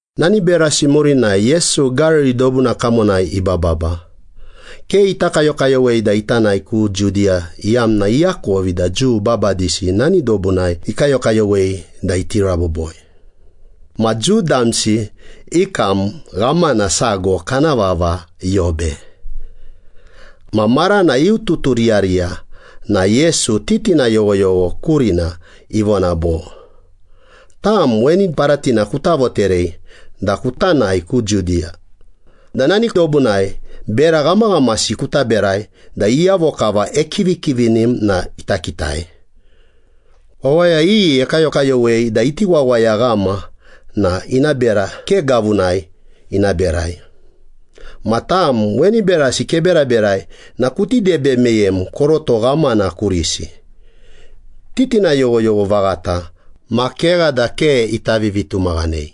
Nani berasi murinai Yesu Gariri dobuna kamonai ibababa. Ke ita kayokayowei da ita nae ku Judiya iyamna iakovi da Jiu babadisi nani dobunai ikayokayowei da iti raboboi. Ma Jiu damsi i kam ghamana sago kana vava Yobe. Ma marana iututuriyariya na Yesu titina yoghoyogho kurina ivona bo, “Tam weni paratina kuta voterei da kuta nae ku Judiya, da nani dobunai bera ghamaghamasi kuta berai da iyavo kava ekivikivinim na ita kitai. Wawaya iyi ekayokayowei da iti wawayaghama na ina bera ke gavunai ina berai. Ma tam weni berasi keberaberai na kuti debe meyem koroto ghamana kurisi.” Titina yoghoyogho vaghata ma kegha da ke ita vivitumaghanei.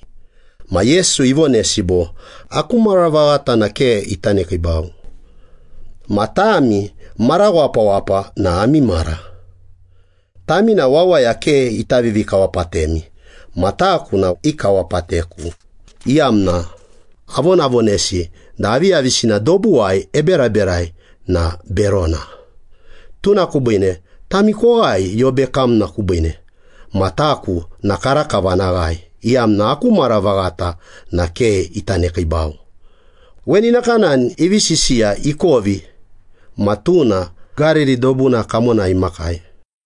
Ma Yesu ivonesi bo, “Aku mara vaghata na ke ita nekiibau. Ma tami mara wapawapa na ami mara. Tami na wawaya ke ita vivikawapatemi ma taku na ikawapateku, iyamna avonavonesi da aviyavisina dobuwai eberaberai na berona. Tuna kubiine tami koghae Yobe kamna kubiine, ma taku na karakava ana ghae, iyamna aku mara vaghata na ke ita nekiibau.” Weni nakanani ivi sisiya ikovi ma tuna Gariri dobuna kamonai imakai.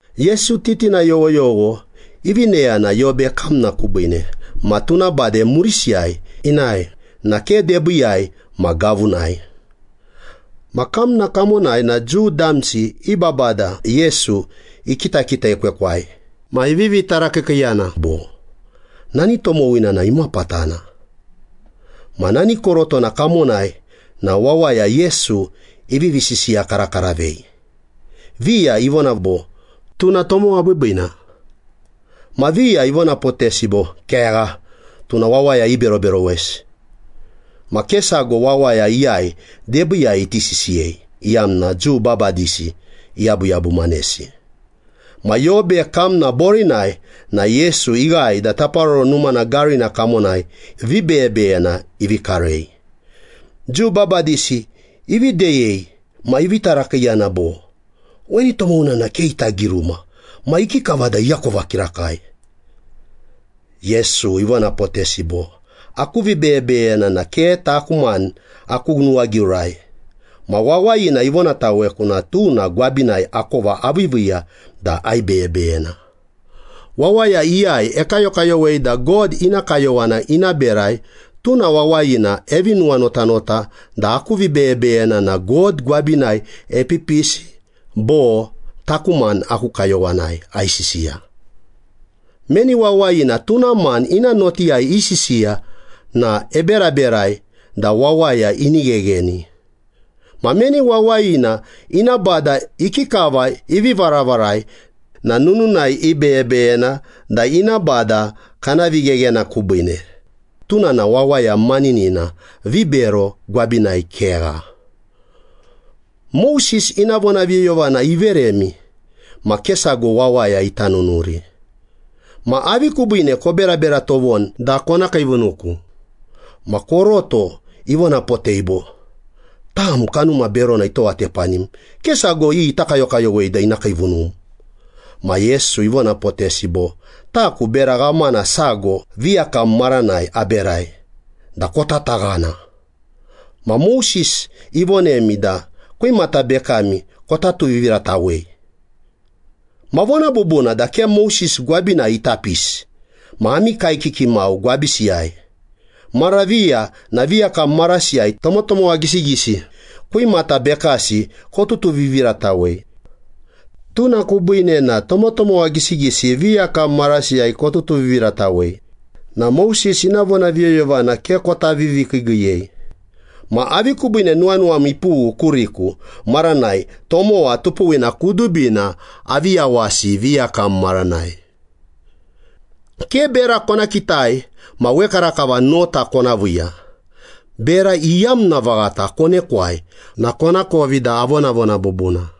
Yesu titina yoghoyogho ivi neyana Yobe kamna kubiine ma tuna bade murisiyai inae na ke debiiyai ma gavunai. Ma kamna kamonai na Jiu damsi i babada Yesu ikitakitekwekwai ma ivivi tarakiikiiyana bo, “Nani tomowina na imapatana?” Ma nani korotona kamonai na wawaya Yesu ivivi sisiyakarakaravei. Viya ivona bo, “Tuna tomowa biibiina.” Ma viya ivonapotesi bo, “Kegha, tuna wawaya iberoberowesi.” Ma ke sago wawaya iyai debiiyai iti sisiyei, iyamna Jiu babadisi iyabuyabumanesi. Ma Yobe kamna borinai na Yesu ighae da Taparoro Numana garina kamonai vibeyebeyena ivi karei. Jiu babadisi ivi deyei ma ivi tarakiiyana bo, “Weni tomowina na ke ita giruma ma ikikava da iakova kirakai?” Yesu ivonapotesi bo, “Aku vibeyebeyena na ke taku mani aku nuwagiurai. Ma wawayina ivonataweku na tuna gwabinai akova aviiviiya da aibeyebeyena. Wawaya iyai ekayokayowei da God ina kayowana ina berai, tuna wawayina evi nuwanotanota da aku vibeyebeyena na God gwabinai epipisi bo taku mani aku kayowanai aisisiya. Meni wawayina tuna mani ina notiyai isisiya na eberaberai da wawaya ini ghegheni. Ma meni wawayina ina bada ikikava ivi varavarai na nununai ibeyebeyena da ina bada kana vigheghena kubiine, tuna na wawaya maninina, vibero gwabinai kegha. Moses ina vonaviyoyovana iveremi ma ke sago wawaya ita nunuri. Ma avi kubiine koberabera tovoni da kona kiivunuku?” Ma koroto ivonapotei bo, “Tam kanuma berona itowatepanim. Ke sago iyi ita kayokayowei da ina kiivunum.” Ma Yesu ivonapotesi bo, “Taku bera ghamana sago viyakam maranai aberai da kotataghana. Ma Moses ivonemi da kwimata bekami kota tuviviratawei. Ma vona bubuna da ke Moses gwabinai ita pisi ma ami kaekiki mau gwabisiyai. Mara viya na viyakam marasiyai tomotomowa gisigisi kwimata bekasi kotutuviviratawei. Tuna kubiine na tomotomowa gisigisi viyakam marasiyai kotutuviviratawei na Moses ina vonaviyoyovana ke kota vivikiigiiyei. Ma avi kubiine nuwanuwami ipughu kuriku maranai tomowa tupuwina kudubina avi yawasi viyakam maranai? Ke bera kona kitai ma wekarakava nota kona viiya. Bera iyamna vaghata konekwai na konakovi da avonavona bubuna.”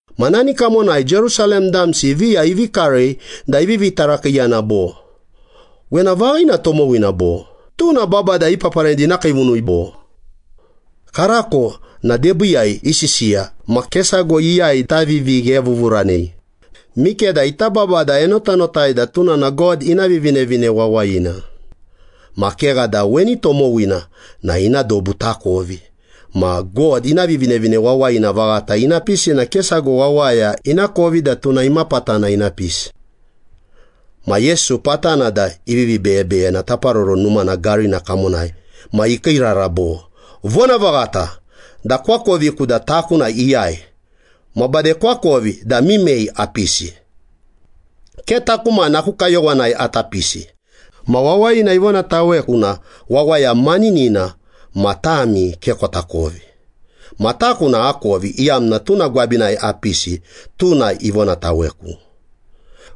Ma nani kamonai Jerusalem damsi viya ivi karei da ivivi tarakiiyana bo, “Wena vaghina tomowina, bo? Tuna babada ipaparanei da ina kiivunui, bo? Karako na debiiyai isisiya ma ke sago iyai ita vivighevuvuranei. Mikeda ita babada enotanotai da tuna na God ina Vivinevine Wawayina. Ma kegha da weni tomowina na ina dobu takovi. Ma God ina Vivinevine Wawayina vaghata ina pisi na ke sago wawaya inakovi da tuna imapatana ina pisi.” Ma Yesu patana da ivivi beyebeyena Taparoro Numana garina kamonai ma ikiirara bo, “Vonavaghata da koakoviku da taku iyai ma bade koakovi da mimei apisi. Ke taku mani aku kayowanai ata pisi. Ma wawayina ivonataweku na wawaya maninina ma tami ke kotakovi. Ma taku na akovi, iyamna tuna gwabinai apisi, tuna ivonataweku.”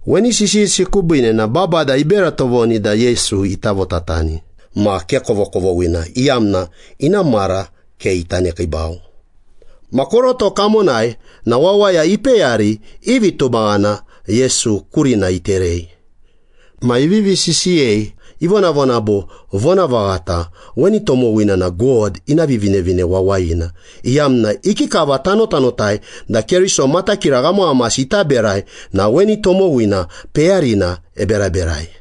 Weni sisiyisi kubiine na babada ibera tovoni da Yesu ita votatani, ma ke kovokovoghina, iyamna ina mara ke ita nekiibau. Ma koroto kamonai na wawaya ipeyari i vitumaghana Yesu kurina iterei. Ma ivivi sisiyei, ivonavona bo, “Vonavaghata, weni tomowina na God ina Vivinevine Wawayina, iyamna ikikava tanotanotai da Keriso matakira ghamaghamasi ita berai na weni tomowina peyarina eberaberai.”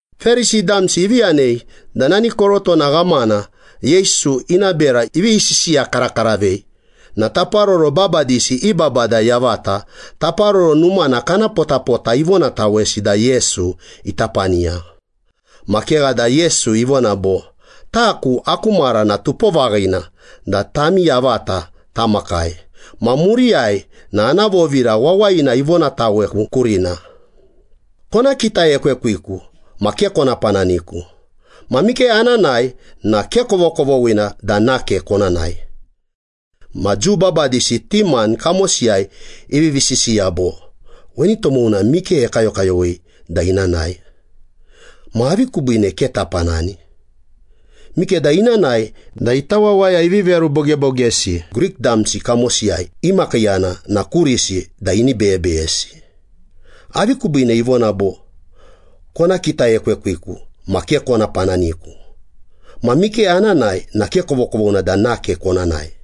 Perisi damsi ivi yanei da nani korotona ghamana Yesu ina bera ivivi sisiyakarakaravei na taparoro babadisi i babada yavata Taparoro Numana kana potapota ivonatawesi da Yesu ita paniya. Ma kegha da Yesu ivona bo, “Taku aku mara na tupo vaghina da tami yavata tamakai, ma muriyai na ana vovira wawayina ivonataweku kurina. Kona kitaekwekwiku ma ke kona pananiku, ma mike ana nae na ke kovokovoghina da nake kona nae.” Ma Jiu babadisi ti mani kamosiyai ivivi sisiya bo, “Weni tomowina mike ekayokayowei da ina nae? Ma avi kubiine ke tapanani? Mikeda ina nae da ita wawaya ivi verubogebogesi Grik damsi kamosiyai imakiiyana na kurisi da ini beyebeyesi.” “Avi kubiine ivona bo, ‘Kona kitaekwekwiku ma ke kona pananiku, ma mike ana nae na ke kovokovoghina da nake kona nae?’”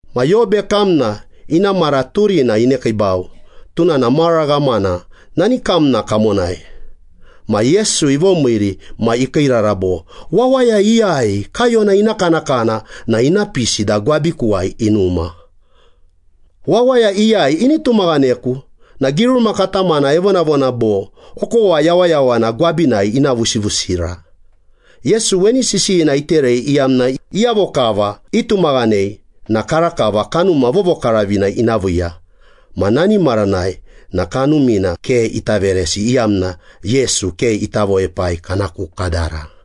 Ma Yobe kamna ina mara turina inekiibau, tuna na mara ghamana nani kamna kamonai. Ma Yesu ivomiiri ma ikiirara bo, “Wawaya iyai kaiyona ina kanakana na ina pisi da gwabikuwai inuma. Wawaya iyai ini tumaghaneku na giruma katamana evonavona bo, ‘Okowa yawayawana gwabinai ina vusivusira.’” Yesu weni sisiyina iterei iyamna iyavo kava itumaghanei na karakava Kanuma Vovokaravina ina viiya. Ma nani maranai na Kanumina ke ita veresi, iyamna Yesu ke ita voepai kana ku kadara.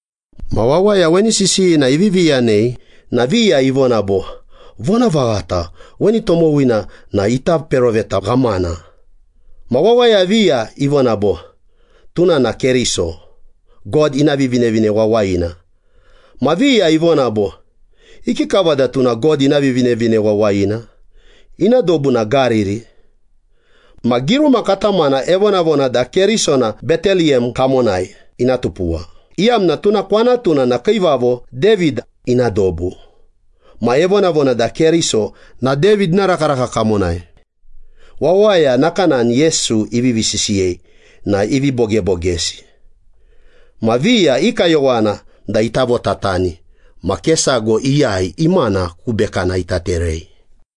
Ma wawaya weni sisiyina ivivi yanei na viya ivona bo, “Vonavaghata weni tomowina na ita peroveta ghamana.” Ma wawaya viya ivona bo, “Tuna na Keriso, God ina Vivinevine Wawayina.” Ma viya ivona bo, “Ikikava da tuna God ina Vivinevine Wawayina? Ina dobu na Gariri. Ma giruma katamana evonavona da Keriso na Beteliyem kamonai ina tupuwa, iyamna tuna kwanatuna na Kiivavo David ina dobu. Ma evonavona da Keriso na David ina rakaraka kamonai.” Wawaya nakanani Yesu ivivi sisiyei na ivi bogebogesi. Ma viya i kayowana da ita votatani ma ke sago iyai imana ku bekana ita terei.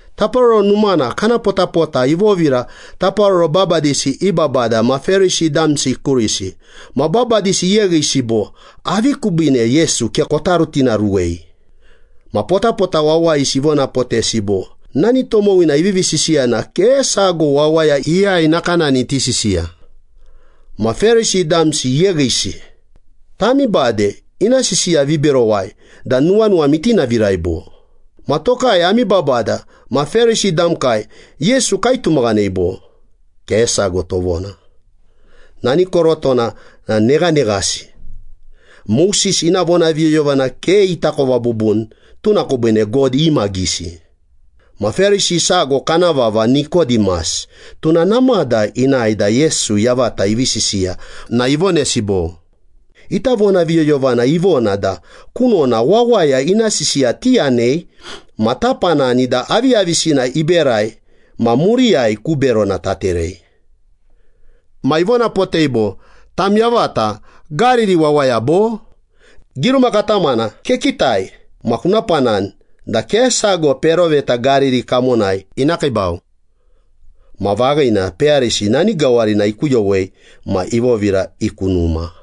Taparoro Numana kana potapota ivovira taparoro babadisi i babada ma Perisi damsi kurisi. Ma babadisi iyeghisi bo, “Avi kubiine Yesu ke kota rutinaruwei?” Ma potapota wawayisi ivonapotesi bo, “Nani tomowina ivivi sisiya na ke sago wawaya iyai nakanani iti sisiya.” Ma Perisi damsi iyeghisi. “Tami bade ina sisiya viberowai da nuwanuwami itinavirai, bo? Ma tokai ami babada ma Perisi damkai Yesu kaitumaghanei, bo? Ke sago tovona. Nani korotona na neghaneghasi, Moses ina vonaviyoyovana ke itakova bubuni, tuna kubiine God imagisi.” Ma Perisi sago kana vava Nikodimas, tuna namada inae da Yesu yavata ivi sisiya na ivonesi bo, “Ita vonaviyoyovana ivona da kunona wawaya ina sisiya tiyanei ma tapanani da aviyavisina iberai ma muriyai ku berona taterei.” Ma ivonapotei bo, “Tam yavata Gariri wawaya bo? Giruma katamana kekitai ma kuna panani da ke sago peroveta Gariri kamonai ina kiibau.” Ma vaghina, peyarisi nani gawarina ikuyowei ma ivovira i ku numa.